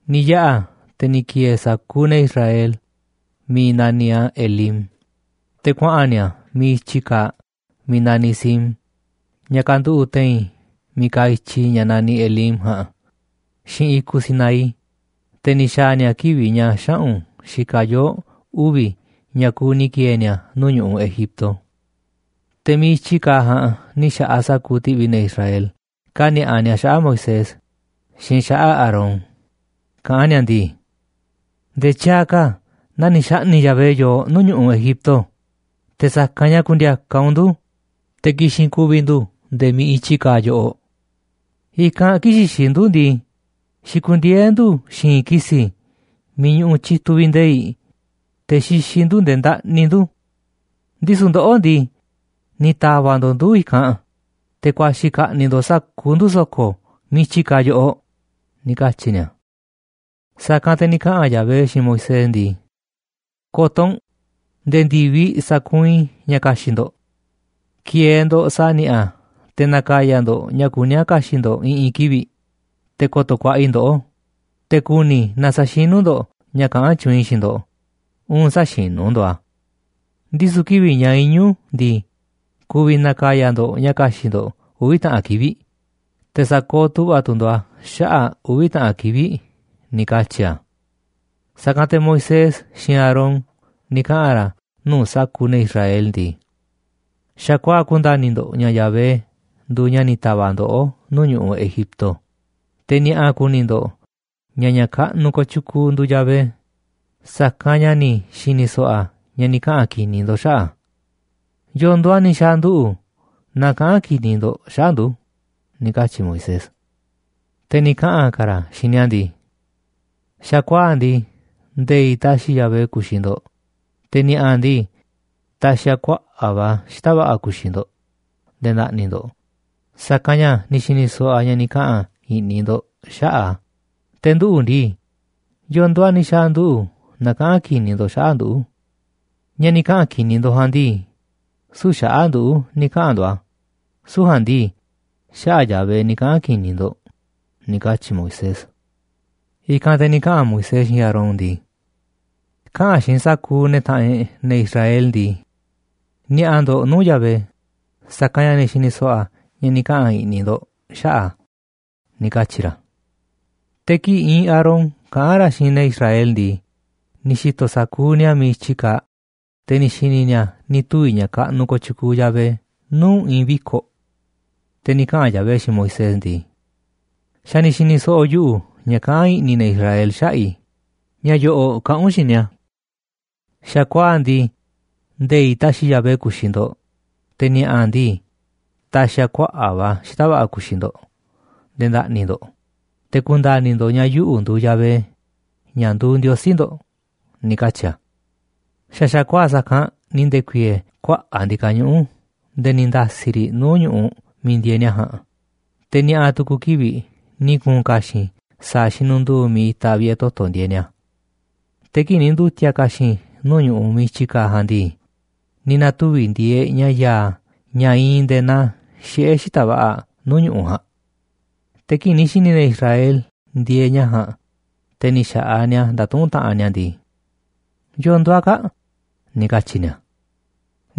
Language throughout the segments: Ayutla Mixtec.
Ni̱ yaꞌa̱ te̱ ni̱ ki̱e̱e̱ sa̱kuuꞌ ne̱ Israel miiꞌ naniꞌ a̱ Elim, te̱ kuaꞌa̱n ni̱a̱ miiꞌ i̱tyi kaaꞌ miiꞌ naniꞌ Sin ña̱ kanduꞌu̱ꞌ te̱i̱n miiꞌ kaaꞌ i̱tyi ña̱ naniꞌ Elim ja̱a̱nꞌ xiinꞌ i̱kuꞌ Sinaí. Te̱ ni̱ xa̱a̱ ni̱a̱ kivi̱ꞌ ña̱ xaꞌu̱n xikaꞌ yoo̱ꞌ uvi̱ ña̱ kuuꞌ ni̱ ki̱e̱e̱ ni̱a̱ nuu̱ꞌ ñu̱ꞌuꞌ Egipto. Te̱ miiꞌ i̱tyi kaaꞌ ja̱a̱nꞌ ni̱ xa̱ꞌaꞌ sa̱kuuꞌ ti̱ꞌvi̱ ne̱ Israel kani̱a̱ꞌa ni̱a̱ xaꞌa̱ꞌ Moisés xiinꞌ xaꞌa̱ꞌ Aarón, kaꞌán ni̱a̱ ndii: ―Nde̱e̱ tyaaꞌ ka̱ na ni̱ xa̱ꞌni̱ꞌ Yahvé yooꞌ nuu̱ꞌ ñu̱ꞌuꞌ Egipto te̱ sa̱kanꞌ ña̱ ku̱ndi̱a̱ka̱ u̱nꞌ ndu̱ te̱ ki̱xi̱n ku̱vi̱ ndu̱ nde̱e̱ miiꞌ i̱tyi kaaꞌ yoꞌoꞌ. I̱kanꞌ kii̱ꞌ xixiꞌ ndu̱ ndii, xikundieé ndu̱ xi̱i̱nꞌ ki̱si̱ miiꞌ ñuꞌuꞌ tyituꞌ vi̱ꞌ nde̱i̱ꞌ, te̱ xixiꞌ ndu̱ nde̱e̱ ndaꞌni ndu̱. Ndisu̱ ndoꞌó ndii, ni̱ ta̱va̱ꞌ ndo̱ꞌ ndu̱ i̱kanꞌ te̱ ku̱a̱xi̱ ka̱ꞌni̱ꞌ ndo̱ꞌ sa̱kuuꞌ ndu̱ so̱ko̱ miiꞌ i̱tyi kaaꞌ yoꞌoꞌ ―ni̱ katyi̱ ni̱a̱. Sa̱kanꞌ te̱ ni̱ kaꞌa̱n Yahvé xiinꞌ Moisés ndii: ―Ko̱to̱ u̱nꞌ, nde̱e̱ ndi̱viꞌ sa̱kuunꞌ i̱ ña̱ ka̱xi̱ꞌ ndo̱ꞌ. Ki̱e̱e̱ ndo̱ꞌ sa̱a̱ ni̱a̱ꞌa̱ te̱ na̱ka̱ya̱ ndo̱ꞌ ña̱ kuní a̱ ka̱xi̱ꞌ ndo̱ꞌ i̱ꞌi̱n kivi̱ꞌ, te̱ ko̱to̱ ku̱a̱ꞌa̱ i̱ ndoꞌó, te̱ ku̱ni̱ i̱ naaꞌ sa̱xinu̱ ndo̱ꞌ ña̱ kaꞌán tyuunꞌ i̱ xiinꞌ ndo̱ꞌ uun sä̱xinu̱ ndo̱ꞌ a̱. Ndisu̱ kivi̱ꞌ ña̱ iñu̱ ndii, ku̱vi̱ na̱ka̱ya̱ ndo̱ꞌ ña̱ ka̱xi̱ꞌ ndo̱ꞌ uvi̱ taꞌan kivi̱ꞌ, te̱ sa̱kooꞌ tu̱ꞌva̱ tu̱ ndo̱ꞌ a̱ xaꞌa̱ꞌ uvi̱ taꞌan kivi̱ꞌ ―ni̱ katyi̱ a̱. Sa̱kanꞌ te̱ Moisés xiinꞌ Aarón ni̱ kaꞌa̱n ra̱ nuu̱ꞌ sa̱kuuꞌ ne̱ Israel ndii: ―Xa̱kuaa̱ꞌ ku̱nda̱ni̱ ndo̱ꞌ ña̱ Yahvé nduuꞌ ña̱ ni̱ ta̱va̱ꞌ ndoꞌó nuu̱ꞌ ñu̱ꞌuꞌ Egipto, te̱ ni̱a̱ꞌa̱ ku̱ni̱ ndo̱ꞌ ña̱ ña̱ kaꞌnuꞌ kooꞌ tyukuu nduuꞌ Yahvé, sa̱kanꞌ ña̱ ni̱ xi̱ni̱ so̱ꞌo̱ a̱ ña̱ ni̱ kaꞌa̱n ki̱ni̱ ndo̱ꞌ xaꞌa̱ꞌ a̱. ¿Yo̱o̱ nduuꞌ a̱ ni̱ xa̱a̱ nduꞌu̱ na kaꞌán ki̱ni̱ ndo̱ꞌ xaꞌa̱ꞌ ndu̱? ―ni̱ katyi̱ Moisés. Te̱ ni̱ kaꞌa̱n ka̱ ra̱ xiinꞌ ni̱a̱ ndii: ―Xa̱kuaa̱ꞌ ndii, nde̱i̱ꞌ ta̱xi̱ Yahvé ku̱xi̱ ndo̱ꞌ, te̱ ni̱a̱ꞌa̱ ndii, ta̱xi̱ a̱ kuaꞌa̱ꞌ va̱ xita̱ꞌ va̱ꞌa̱ ku̱xi̱ ndo̱ꞌ nde̱e̱ nda̱ꞌni̱ ndo̱ꞌ, sa̱kanꞌ ña̱ ni̱ xi̱ni̱ so̱ꞌo̱ a̱ ña̱ ni̱ kaꞌa̱n i̱ꞌni̱ ndo̱ꞌ xaꞌa̱ꞌ a̱, te̱ nduꞌu̱ ndii, ¿yo̱o̱ nduuꞌ a̱ ni̱ xa̱a̱ nduꞌu̱ na kaꞌán ki̱ni̱ ndo̱ꞌ xaꞌa̱ꞌ ndu̱? Ña̱ ni̱ kaꞌa̱n ki̱ni̱ ndo̱ꞌ ja̱a̱nꞌ ndii, süu̱ꞌ xaꞌa̱ꞌ nduꞌu̱ ni̱ kaꞌa̱n ndo̱ꞌ a̱, süu̱ꞌ ja̱a̱nꞌ ndii, xaꞌa̱ꞌ Yahvé ni̱ kaꞌa̱n ki̱ni̱ ndo̱ꞌ ―ni̱ katyi̱ Moisés. I̱kanꞌ te̱ ni̱ kaꞌa̱n Moisés xiinꞌ Aarón ndii: ―Kaꞌa̱n xiinꞌ sa̱kuuꞌ ne̱ taꞌanꞌ e̱ꞌ, ne̱ Israel ndii: “Ni̱a̱ꞌa̱ ndo̱ꞌ nuu̱ꞌ Yahvé, sa̱kanꞌ ña̱ ni̱ xi̱ni̱ so̱ꞌo̱ a̱ ña̱ ni̱ kaꞌa̱n i̱ꞌni̱ ndo̱ꞌ xaꞌa̱ꞌ a̱” ―ni̱ katyi̱ ra̱. Te̱ kii̱ꞌ iinꞌ Aarón kaꞌán ra̱ xiinꞌ ne̱ Israel ndii, ni̱ xi̱to̱ sa̱kuuꞌ ni̱a̱ miiꞌ i̱tyi kaaꞌ, te̱ ni̱ xi̱ni̱ ni̱a̱ ni̱ tuvi̱ ña̱ kaꞌnuꞌ kooꞌ tyukuuꞌ Yahvé nuu̱ꞌ i̱i̱n viko̱ꞌ. Te̱ ni̱ kaꞌa̱n Yahvé xiinꞌ Moisés ndii: ―Xa̱ ni̱ xi̱ni̱ so̱ꞌo̱ yuꞌu̱ ña̱ kaꞌán i̱ꞌni̱ ne̱ Israel xaꞌa̱ꞌ i̱. Ña̱ yo̱ꞌo̱ꞌ kaꞌa̱n u̱nꞌ xiinꞌ ni̱a̱: “Xa̱kuaa̱ꞌ ndii, nde̱i̱ꞌ ta̱xi̱ Yahvé ku̱xi̱ ndo̱ꞌ, te̱ ni̱a̱ꞌa̱ ndii, ta̱xi̱ a̱ kuaꞌa̱ꞌ va̱ xita̱ꞌ va̱ꞌa̱ ku̱xi̱ ndo̱ꞌ nde̱e̱ nda̱ꞌni̱ ndo̱ꞌ, te̱ ku̱nda̱ni̱ ndo̱ꞌ ña̱ yuꞌu̱ nduuꞌ Yahvé, ña̱ nduuꞌ Ndiosí ndo̱ꞌ” ―ni̱ katyi̱ a̱. Xa̱ xa̱kuaa̱ꞌ sa̱kanꞌ ni̱ nde̱ku̱i̱e̱e̱ kuaꞌa̱ꞌ ndi̱ka̱ñuꞌu̱ꞌ nde̱e̱ ni̱ nda̱si̱ riꞌ nuu̱ꞌ ñu̱ꞌuꞌ miiꞌ ndieeꞌ ni̱a̱ ja̱a̱nꞌ, te̱ ni̱a̱ꞌa̱ tu̱ku̱ kivi̱ꞌ ni̱ ku̱u̱n ka̱xi̱n sa̱a̱ xinunduu miiꞌ itaꞌ vi̱ꞌe̱ toto̱ ndieeꞌ ni̱a̱. Te̱ kii̱ꞌ ni̱ ndu̱ti̱a̱ ka̱xi̱n nuu̱ꞌ ñu̱ꞌuꞌ miiꞌ i̱tyi kaaꞌ ja̱a̱nꞌ ndii, ni̱ na̱tuvi̱ ndieeꞌ ña̱ ya̱a̱ ña̱ iinꞌ nde̱e̱ naa xiꞌe̱ xita̱ꞌ va̱ꞌa̱ nuu̱ꞌ ñu̱ꞌuꞌ ja̱a̱nꞌ. Te̱ kii̱ꞌ ni̱ xi̱ni̱ ne̱ Israel ndieeꞌ ña̱ ja̱a̱nꞌ, te̱ ni̱ xa̱ꞌaꞌ ni̱a̱ ndatuꞌúnꞌ taꞌanꞌ ni̱a̱ ndii: ― ¿Yo̱o̱ nduuꞌ a̱ kaa̱ꞌ? ―ni̱ katyi̱ ni̱a̱.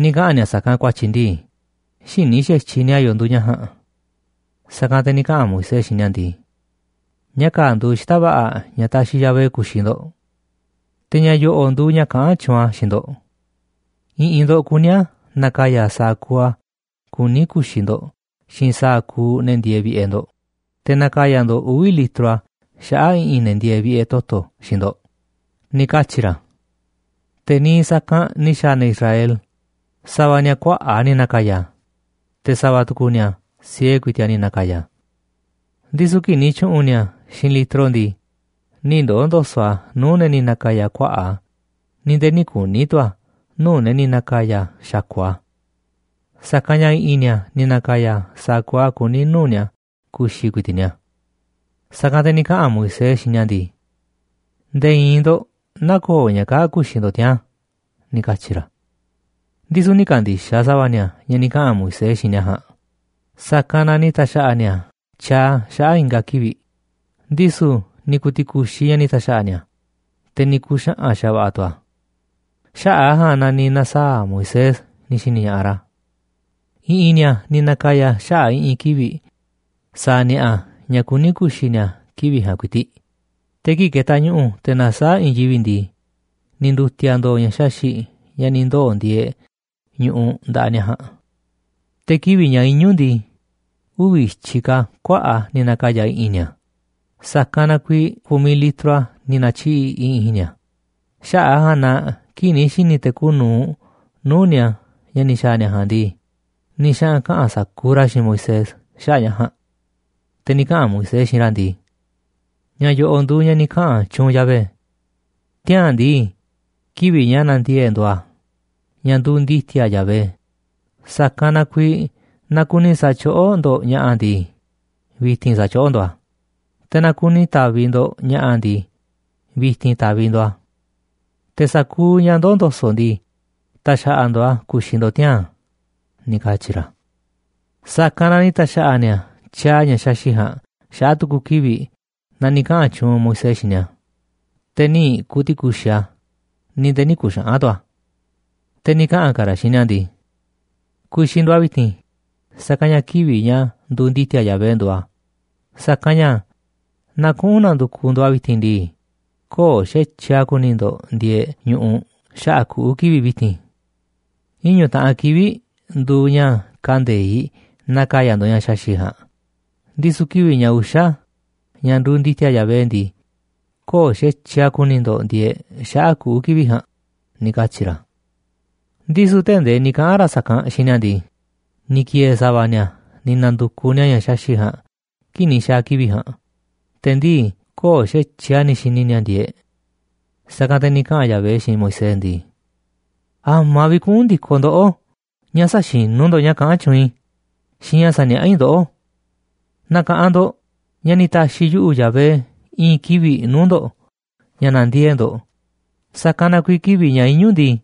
Ni̱ kaꞌa̱n ni̱a̱ sa̱kanꞌ ku̱a̱tyi̱ ndii, xïní xa̱tyiꞌ ni̱a̱ yo̱o̱ nduuꞌ ña̱ ja̱a̱nꞌ. Sa̱kanꞌ te̱ ni̱ kaꞌa̱n Moisés xiinꞌ ni̱a̱ ndii: ―Ña̱ kaa̱ꞌ nduuꞌ xita̱ꞌ va̱ꞌa̱ ña̱ taxiꞌ Yahvé ku̱xi̱ ndo̱ꞌ. Te̱ ña̱ yo̱ꞌo̱ꞌ nduuꞌ ña̱ kaꞌán tyuunꞌ a̱ xiinꞌ ndo̱ꞌ: I̱ꞌi̱n ndo̱ꞌ kuní a̱ na̱ka̱ya̱ sa̱a̱ kuuꞌ a̱ kuní ku̱xi̱ ndo̱ꞌ xiinꞌ sa̱a̱ kuuꞌ ne̱ ndieeꞌ vi̱ꞌe̱ ndo̱ꞌ, te̱ na̱ka̱ya̱ ndo̱ꞌ uvi̱ litro a̱ xaꞌa̱ꞌ i̱ꞌi̱n ne̱ ndieeꞌ vi̱ꞌe̱ toto̱ xiinꞌ ndo̱ꞌ ―ni̱ katyi̱ ra̱. Te̱ niiꞌ sa̱kanꞌ ni̱ xa̱a̱ ne̱ Israel, sa̱va̱ ni̱a̱ kuaꞌa̱ꞌ a̱ ni̱ na̱ka̱ya̱, te̱ sa̱va̱ tu̱ku̱ ni̱a̱ siee ku̱i̱ti̱ꞌ a̱ ni̱ na̱ka̱ya̱. Ndisu̱ kii̱ꞌ ni̱ tyu̱ꞌu̱n ni̱a̱ xiinꞌ litro ndii, nï̱ ndoo̱ ndo̱so̱ꞌ a̱ nuu̱ꞌ ne̱ ni̱ na̱ka̱ya̱ kuaꞌa̱ꞌ a̱, ni̱ nde̱e̱ nï̱ kuni̱ tu̱ a̱ nuu̱ꞌ ne̱ ni̱ na̱ka̱ya̱ xa̱ku̱ꞌ a̱. Sa̱kanꞌ ña̱ i̱ꞌi̱n ni̱a̱ ni̱ na̱ka̱ya̱ sa̱a̱ kuuꞌ a̱ kuní nuu̱ꞌ ni̱a̱ ku̱xi̱ ku̱i̱ti̱ꞌ ni̱a̱. Sa̱kanꞌ te̱ ni̱ kaꞌa̱n Moisés xiinꞌ ni̱a̱ ndii: ―Nde̱e̱ i̱i̱n ndo̱ꞌ nä̱ko̱o̱ ña̱ kaa̱ꞌ ku̱xi̱ ndo̱ꞌ tiaa̱n ―ni̱ katyi̱ ra̱. Ndisu̱ nï̱ ka̱ndi̱xaꞌ sa̱va̱ ni̱a̱ ña̱ ni̱ kaꞌa̱n Moisés xiinꞌ ni̱a̱ ja̱a̱nꞌ, sa̱kanꞌ na ni̱ ta̱xa̱ꞌa̱ ni̱a̱ tyaaꞌ a̱ xaꞌa̱ꞌ i̱nga̱ kivi̱ꞌ, ndisu̱ ni̱ ku̱u̱ ti̱ku̱xiꞌ ña̱ ni̱ ta̱xa̱ꞌa̱ ni̱a̱, te̱ ni̱ ku̱u̱ xaꞌa̱n xa̱va̱ꞌa̱ a̱ tu̱ a̱. Xaꞌa̱ꞌ a̱ ja̱a̱nꞌ na ni̱ na̱saa̱ꞌ Moisés ni̱ xi̱ni̱ ña̱ꞌaꞌ ra̱. I̱ꞌi̱n ni̱a̱ ni̱ na̱ka̱ya̱ xaꞌa̱ꞌ i̱ꞌi̱n kivi̱ꞌ sa̱a̱ ni̱a̱ꞌa̱ ña̱ kuní ku̱xi̱ ni̱a̱ kivi̱ꞌ ja̱a̱nꞌ ku̱i̱ti̱ꞌ, te̱ kii̱ꞌ ketaꞌ ñu̱ꞌu̱ te̱ nasaáꞌ i̱i̱n yivi̱ꞌ ndii, ni̱ ndu̱ti̱a̱ ndo̱o̱ ña̱ xaxi̱ꞌ ña̱ ni̱ ndoo̱ ndieeꞌ ñu̱ꞌuꞌ nda̱ꞌaꞌ ni̱a̱ ja̱a̱nꞌ. Te̱ kivi̱ꞌ ña̱ iñu̱ ndii, uvi̱ i̱tyiꞌ ka̱ kuaꞌa̱ꞌ a̱ ni̱ na̱ka̱ya̱ i̱ꞌi̱n ni̱a̱, sa̱kanꞌ na kuiiꞌ ku̱miꞌ litro a̱ ni̱ na̱tyiꞌi̱ꞌ i̱ꞌi̱n ni̱a̱. Xaꞌa̱ꞌ a̱ ja̱a̱nꞌ na kii̱ꞌ ni̱ xi̱ni̱ te̱ kuuꞌ nu̱uꞌ nuu̱ꞌ ni̱a̱ ña̱ ni̱ xa̱a̱ ni̱a̱ ña̱ ja̱a̱nꞌ ndii, ni̱ xaꞌa̱n kaꞌa̱n sa̱kuuꞌ ra̱ xiinꞌ Moisés xaꞌa̱ꞌ ña̱ ja̱a̱nꞌ. Te̱ ni̱ kaꞌa̱n Moisés xiinꞌ ra̱ ndii: ―Ña̱ yo̱ꞌo̱ꞌ nduuꞌ ña̱ ni̱ kaꞌa̱n tyuunꞌ Yahvé: “Tiaa̱n ndii, kivi̱ꞌ ña̱ nandiee̱ꞌ e̱ꞌ nduuꞌ a̱, ña̱ nduuꞌ ndi̱ti̱a̱ Yahvé, sa̱kanꞌ na kuiiꞌ na kuni sa̱tyoꞌó ndo̱ꞌ ña̱ꞌa̱ ndii, vi̱ti̱n sa̱tyoꞌó ndo̱ꞌ a̱. Te̱ na̱ kuni ta̱vi̱ ndo̱ꞌ ña̱ꞌa̱ ndii, vi̱ti̱n ta̱vi̱ ndo̱ꞌ a̱. Te̱ sa̱kuuꞌ ña̱ ndoo̱ ndo̱so̱ꞌ ndii, ta̱xa̱ꞌa̱ ndo̱ꞌ a̱ ku̱xi̱ ndo̱ꞌ tiaa̱n” ―ni̱ katyi̱ ra̱. Sa̱kanꞌ na ni̱ ta̱xa̱ꞌa̱ ni̱a̱ tyaaꞌ ña̱ xaxi̱ꞌ ja̱a̱nꞌ xaꞌa̱ꞌ tu̱ku̱ kivi̱ꞌ naa ni̱ kaꞌa̱n tyuunꞌ Moisés xiinꞌ ni̱a̱, te̱ nï̱ ku̱ti̱ku̱xiꞌ a̱, ni̱ nde̱e̱ nï̱ ku̱xaꞌa̱n tu̱ a̱. Te̱ ni̱ kaꞌa̱n ka̱ ra̱ xiinꞌ ni̱a̱ ndii: ―Ku̱xi̱ ndo̱ꞌ a̱ vi̱ti̱n, sa̱kanꞌ ña̱ kivi̱ꞌ ña̱ nduuꞌ ndi̱ti̱a̱ Yahvé nduuꞌ a̱, sa̱kanꞌ ña̱ naaꞌ kuꞌu̱n na̱ndu̱kuꞌ ndo̱ꞌ a̱ vi̱ti̱n ndii, köo̱ꞌ xa̱tyiꞌ a̱ ku̱ni̱ ndo̱ꞌ ndieeꞌ ñu̱ꞌuꞌ xaꞌa̱ꞌ kuꞌu̱ kivi̱ꞌ vi̱ti̱n. Iñu̱ taꞌan kivi̱ꞌ nduuꞌ ña̱ kande̱iꞌ na̱ka̱ya̱ ndo̱ꞌ ña̱ xaxi̱ꞌ ja̱a̱nꞌ, ndisu̱ kivi̱ꞌ ña̱ uxa̱, ña̱ nduuꞌ ndi̱ti̱a̱ Yahvé ndii, köo̱ꞌ xa̱tyiꞌ a̱ ku̱ni̱ ndo̱ꞌ ndieeꞌ xaꞌa̱ꞌ kuꞌu̱ kivi̱ꞌ ja̱a̱nꞌ ―ni̱ katyi̱ ra̱. Ndisu̱ tee̱ꞌ ndee ni̱ kaꞌa̱n ra̱ sa̱kanꞌ xiinꞌ ni̱a̱ ndii, ni̱ ki̱e̱e̱ sa̱va̱ ni̱a̱ ni̱ na̱ndukuꞌ ni̱a̱ ña̱ xaxi̱ꞌ ja̱a̱nꞌ kii̱ꞌ ni̱ xa̱a̱ kivi̱ꞌ ja̱a̱nꞌ, te̱ ndii köo̱ꞌ xa̱tyiꞌ a̱ ni̱ xi̱ni̱ ni̱a̱ ndieeꞌ. Sa̱kanꞌ te̱ ni̱ kaꞌa̱n Yahvé xiinꞌ Moisés ndii: ―¿A̱ma̱ vi̱ꞌ kuꞌu̱n ndi̱koꞌ ndoꞌó ña̱ sä̱xinu̱ ndo̱ꞌ ña̱ kaꞌán tyuunꞌ i̱ xiinꞌ ña̱ saniaꞌá i̱ ndoꞌó? Na̱ka̱ꞌanꞌ ndo̱ꞌ ña̱ ni̱ ta̱xi̱ yuꞌu̱, Yahvé, i̱i̱n kivi̱ꞌ nuu̱ꞌ ndo̱ꞌ ña̱ na̱ndiee̱ꞌ ndo̱ꞌ, sa̱kanꞌ na kuiiꞌ kivi̱ꞌ ña̱ iñu̱ ndii,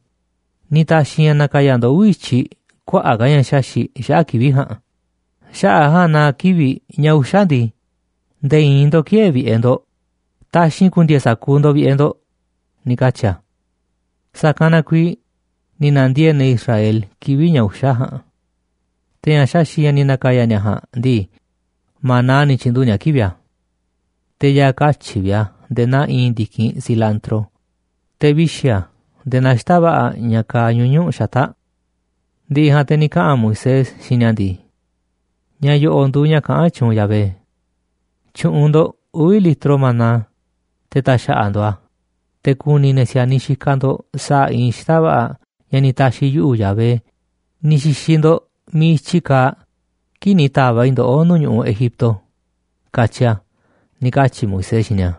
ni̱ ta̱xi̱ i̱ ña̱ na̱ka̱ya̱ ndo̱ꞌ uvi̱ i̱tyiꞌ kuaꞌa̱ꞌ ka̱ ña̱ xaxi̱ꞌ xaꞌa̱ꞌ kivi̱ꞌ ja̱a̱nꞌ. Xaꞌa̱ꞌ a̱ ja̱a̱nꞌ na kivi̱ꞌ ña̱ uxa̱ ndii, nde̱e̱ i̱i̱n ndo̱ꞌ kï̱e̱e̱ vi̱ꞌe̱ ndo̱ꞌ, taxi̱nꞌ ku̱ndi̱e̱e̱ sa̱kuuꞌ ndo̱ꞌ vi̱ꞌe̱ ndo̱ꞌ ―ni̱ katyi̱ a̱. Sa̱kanꞌ na kuiiꞌ ni̱ na̱ndiee̱ꞌ ne̱ Israel kivi̱ꞌ ña̱ uxa̱ ja̱a̱nꞌ. Te̱ ña̱ xaxi̱ꞌ ña̱ ni̱ na̱ka̱ya̱ ni̱a̱ ja̱a̱nꞌ ndii, maná ni̱ tyi̱nduꞌu̱ꞌ ni̱a̱ kivi̱ꞌ a̱. Te̱ ya̱a̱ katyi̱ꞌ vi̱ꞌ a̱ nde̱e̱ naa iinꞌ ndi̱kinꞌ cilantro, te̱ vixi̱ a̱ nde̱e̱ naaꞌ xita̱ꞌ va̱ꞌa̱ ña̱ kaaꞌ ñuñu̱ꞌ xata̱ꞌ. Ndi̱ꞌi̱ ja̱a̱nꞌ te̱ ni̱ kaꞌa̱n Moisés xiinꞌ ni̱a̱ ndii: ―Ña̱ yo̱ꞌo̱ꞌ nduuꞌ ña̱ kaꞌán tyuunꞌ Yahvé: “Tyu̱ꞌu̱n ndo̱ꞌ uvi̱ litro maná, te̱ ta̱xa̱ꞌa̱ ndo̱ꞌ a̱, te̱ ku̱ni̱ ne̱ si̱a̱niꞌ xikaꞌ ndo̱ꞌ sa̱a̱ iinꞌ xita̱ꞌ va̱ꞌa̱ ña̱ ni̱ ta̱xi̱ yuꞌu̱, Yahvé, ni̱ xi̱xi̱ ndo̱ꞌ miiꞌ i̱tyi kaaꞌ kii̱ꞌ ni̱ ta̱va̱ꞌ i̱ ndoꞌó nuu̱ꞌ ñu̱ꞌuꞌ Egipto”, katyi a̱ ―ni̱ katyi̱ Moisés xiinꞌ ni̱a̱.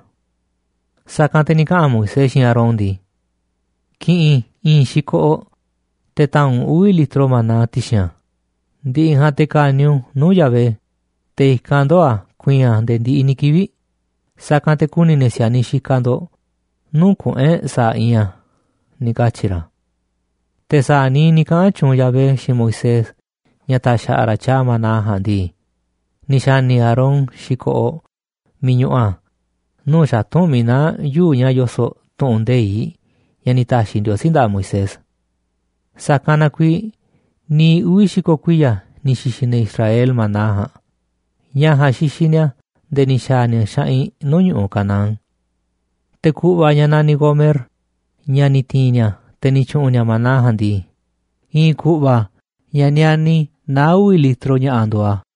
Sa̱kanꞌ te̱ ni̱ kaꞌa̱n Moisés xiinꞌ Aarón ndii: ―Ki̱ꞌi̱n i̱i̱n xi̱koꞌoꞌ, te̱ ta̱a̱nꞌ u̱nꞌ uvi̱ litro maná ti̱xi̱n a̱, ndi̱ꞌi̱ ja̱a̱nꞌ te̱ ka̱ni̱ u̱nꞌ nuu̱ꞌ Yahvé, te̱ i̱kanꞌ ndoo̱ a̱ ku̱i̱i̱n a̱ nde̱e̱ ndiꞌiꞌ ni̱ kivi̱ꞌ, sa̱kanꞌ te̱ ku̱ni̱ ne̱ si̱a̱niꞌ xikaꞌ ndo̱ꞌ nuu̱ꞌ kuꞌu̱n e̱ꞌ sa̱a̱ iinꞌ a̱ ―ni̱ katyi̱ ra̱. Te̱ sa̱a̱ niiꞌ ni̱ kaꞌa̱n tyuunꞌ Yahvé xiinꞌ Moisés ña̱ ta̱xa̱ꞌa̱ ra̱ tyaaꞌ maná ja̱a̱nꞌ ndii, ni̱ xa̱ni̱ Aarón xi̱koꞌoꞌ miiꞌ ñuꞌuꞌ a̱ nuu̱ꞌ xatu̱nꞌ miiꞌ naá yuu̱ꞌ ña̱ yoso̱ꞌ tu̱ꞌu̱n nde̱iꞌ ña̱ ni̱ ta̱xi̱ Ndiosí nda̱ꞌaꞌ Moisés. Sa̱kanꞌ na kuiiꞌ niiꞌ uvi̱ xi̱ko̱ kuiya̱ ni̱ xi̱xi̱ ne̱ Israel maná ja̱a̱nꞌ. Ña̱ ja̱a̱nꞌ xixiꞌ ni̱a̱ nde̱e̱ ni̱ xa̱a̱ ni̱a̱ xaꞌinꞌ nuu̱ꞌ ñu̱ꞌuꞌ Canaán. Te̱ ku̱ꞌva̱ ña̱ naniꞌ gomer, ña̱ ni̱ ti̱i̱n ni̱a̱, te̱ ni̱ tyu̱ꞌu̱n ni̱a̱ maná ja̱a̱nꞌ ndii, i̱i̱n ku̱ꞌva̱ ña̱ niani naá uvi̱ litro, ña̱ꞌa̱ nduuꞌ a̱.